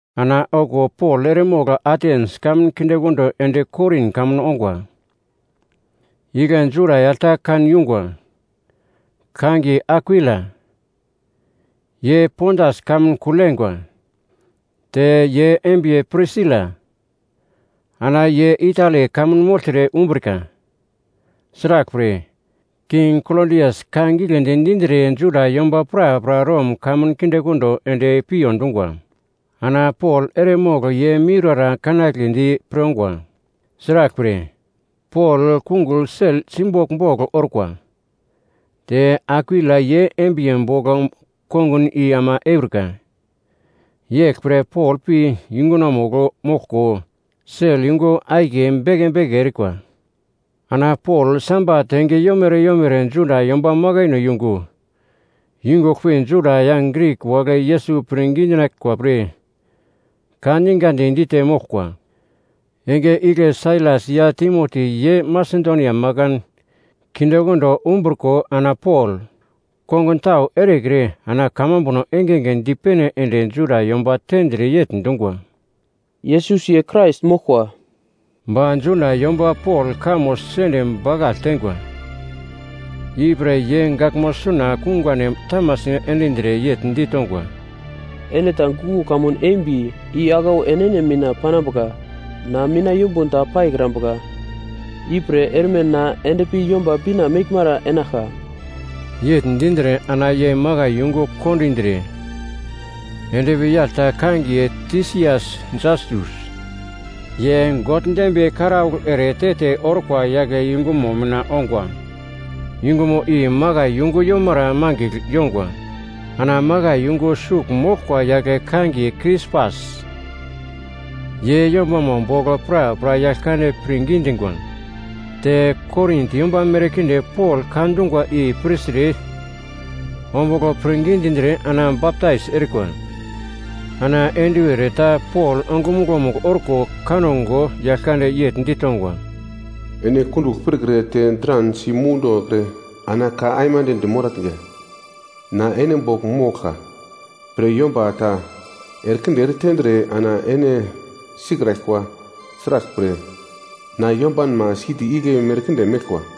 Ana okuwo Pol eremogl Atens kamun kindekondo ende Korin kamun ongwa. Igle Juda yagl ta kan yungwa, kangiye Akwila, ye Pontas kamun kugl yengwa. Te ye embiye Prisila, ana ye Itali kamun mogltre umbrika. Sraglpre, king Klodias ka giglendi dindre Juda yomba prapra Rom kamun kindekondo ende piyo dungwa. Ana Pol eremogl ye miurara kanagledi pre ongwa. Sraglpre, Pol kungugl sel simbogl bogl orkwa, te Akwila ye embiye bogl kongun i ama eurika. Yeglpre Pol pi yungunomugl moglko sel yungu akiye bange bange erikwa. Ana Pol Sabat enge yomere yomere Juda yomba makaino yungu yungugl pi Juda ya Grik wagle Yesus pirngi dinaglkwa pre ka ningadi dite moglkwa. Enge igle Sailas ya Timoti ye Masedonia makan kindekondo umbriko ana Pol kongun tau erekre ana kamambuno engenge dipene ende Juda yomba tendre yegl dungwa, “Yesus ye Krais moglkwa.” Ba Juda yomba Pol kamo sende bakagl teingwa, ipre ye gaglmo suna kungane tamasi endindre yegl ditongwa, “Ene ta guglo kamun embi i aglau enene mina panambuka. Na mina yumbun ta paikrambuka. Ipre erme na endpi Yomba Bina meglmara enaglka.” Yegl dindre ana ye makai yungu kondindre endpi yagl ta kangiye Tisias Jastus, ye God dembiye karaugl ere te-te orkwa yagle yungumo mina ongwa, yungumo i makai yungu yomara mangigl yongwa. Ana makai yungu sugl moglkwa yagle kangiye Krispas, ye yombamo bogl prapra Yaglkande pirngi dingwa, te Korin yomba merkinde Pol ka dungwa i pirtre ombugl pirngi dindre ana baptais erikwa. Ana enduwer ta Pol ongumuglo-mugl orko kango Yaglkande yegl ditongwa, “Ene kundugl pirkre te dran simundokre ana ka aimande dimoratnga. Na ene bogl moglka pre yomba ta erekinde eretendre ana ene sikraglkwa. Sraglpre, na yombanma siti igle merkinde meglkwa.”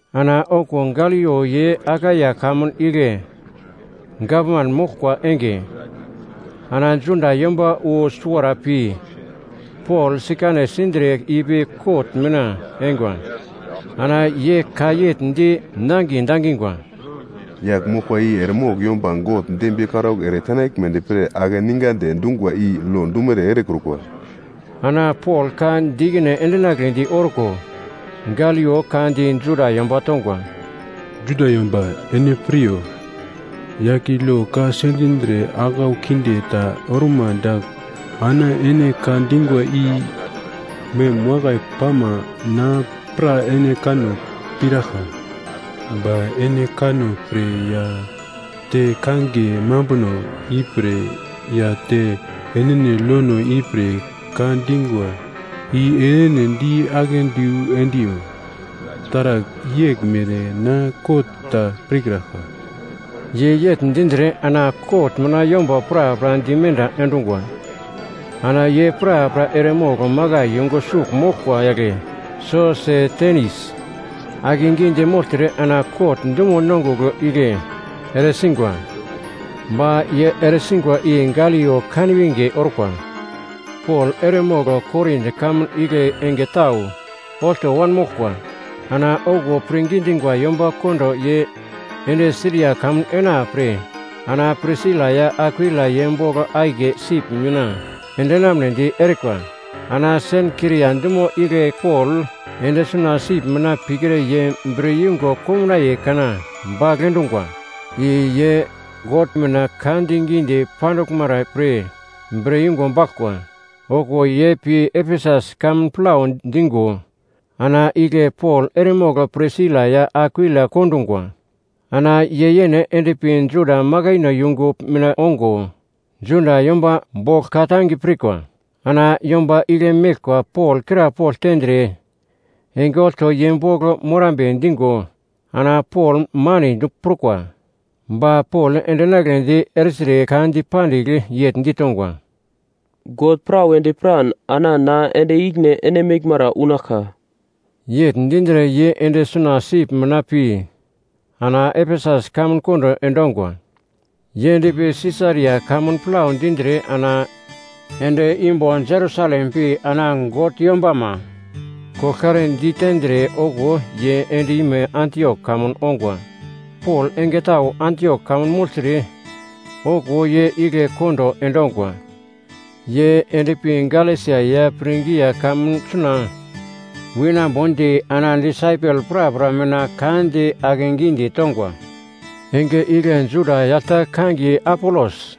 Ana okuwo Galio ye Akaia kamun igle gavman moglkwa enge, ana Juda yomba wu suwara pi Pol sikane sindre ipi kot mina eingwa. Ana ye ka yegl di nangiye dangingwa, “Yagl moglkwa i eremogl yomba God dembiye karaugl ere tenaglmedi pre akeningandi dungwa i lo dumere erekrukwa.” Ana Pol ka di ikine endinagledi orko, Galio ka di Juda yomba tongwa, “Juda yomba ene piryo, yagl i lo ka sendindre aglau kinde ta orma dagl ana ene ka dingwa i mem wakai pama na pra ene kanno piraglka. Ba ene kanno pre ya te kangiye mambuno ipre ya te enene lono ipre ka dingwa, i enene di akedu endiyo, taragl yeglmere na kot ta pirkraglka.” Ye yegl dindre ana kot mina yomba prapra dimenda endungwa. Ana ye prapra eremogl makai yungu sugl moglkwa yagle Sosetenis akegidi mogltre ana kot dumo nongugl igle eresingwa. Ba ye eresingwa i Galio kanwinge orkwa. Pol eremogl Korin kamun igle enge tau olto wanmoglkwa. Ana okuwo pirngi dingwa yomba kondo ye ende Siria kamun enapre ana Prisila ya Akwila ye bogl akiye sip mina endinamnedi erikwa. Ana Senkria dumo igle Pol ende suna sip mina pikre ye bre yungo komnaiye kana bagl endungwa. I ye God mina ka digidi panduglmara pre bre yungu baglkwa. Okuwo ye pi Efesus kamun plau dingo ana igle Pol eremogl Prisila ya Akwila kondungwa. Ana ye yene endpi Juda makaino yungu mina ongo Juda yomba bogl ka-tange pirkwa. Ana yomba igle meglkwa Pol krapogl tendre enge olto ye bogl morambe dingo ana Pol manedi prukwa. Ba Pol endinagledi ertre ka dipandigl yegl ditongwa, “God pra wedi piran ana na ende ikine ene meglmara unaglka.” Yegl dindre ye ende suna sip mina pi ana Efesus kamun kondo endongwa. Ye endpi Sisaria kamun plau dindre ana ende imbo Jerusalem pi ana God yombama koglkare ditendre okuwo ye end-ime Antiok kamun ongwa. Pol enge tau Antiok kamun mogltre okuwo ye igle kondo endongwa. Ye endpi Galesia ya Prigia kamun suna winambodi ana disaipel prapra mina ka di akegi ditongwa. Enge igle Juda yagl ta kangiye Apolos,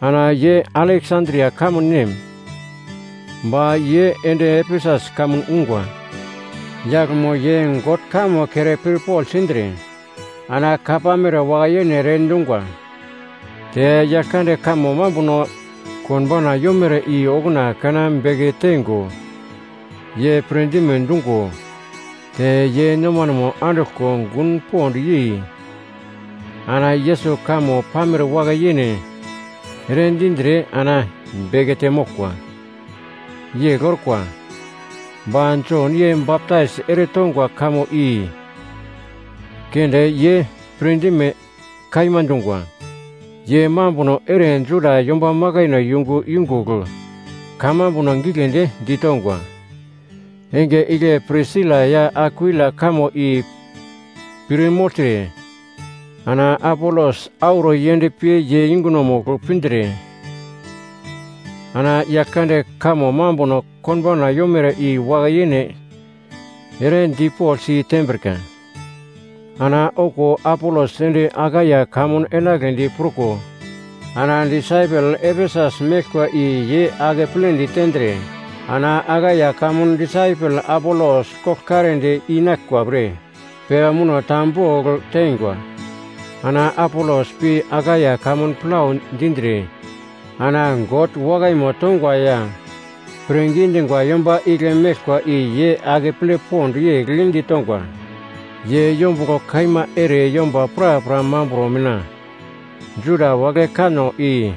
ana ye Aleksandria kamun nem, ba ye ende Efesus kamun ungwa. Yaglmo ye God kamo kere pirpogl sindre ana ka pamere wakai-yene ere dungwa. Te Yaglkande kamo mambuno konbauna yomere i okuna kana beke teingo ye pirdime dungo, te ye nomanemo anduglko gun pond yei ana Yesus kamo pamere wakai-yene ere dindre ana bekete moglkwa. Yegl orkwa, ba Jon ye baptais eretongwa kamo i keunde ye pirdime kaima dungwa. Ye mambuno ere Juda yomba makaino yungu yungugl kamambuno giglendi ditongwa. Enge igle Prisila ya Akwila kamo i pir mogltre, ana Apolos auro yendpi ye yungunomugl pindre ana Yaglkande kamo mambuno konbauna yomere i wakai-yene ere dipogl si tembrika. Ana okuwo Apolos ende Akaia kamun enagledi pruko, ana disaipel Efesus meglkwa i ye akepledi tendre ana Akaia kamun disaipel Apolos koglkaredi inaglkwa pre pepa muno ta bogl teingwa. Ana Apolos pi Akaia kamun plau dindre ana God wakaimo tongwa ya pirngi dingwa yomba igle meglkwa i ye akeple pond yegl ditongwa. Ye yombuglo kaima ere yomba prapra mambro mina Juda wagle kanno i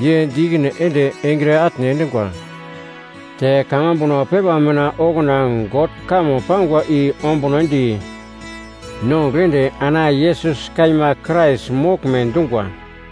ye di ikine ende engre atne endungwa te kamambuno pepa mina okuna God kamo pangwa i ombunodi nongugl ende ana Yesus kaima Krais moglme dungwa.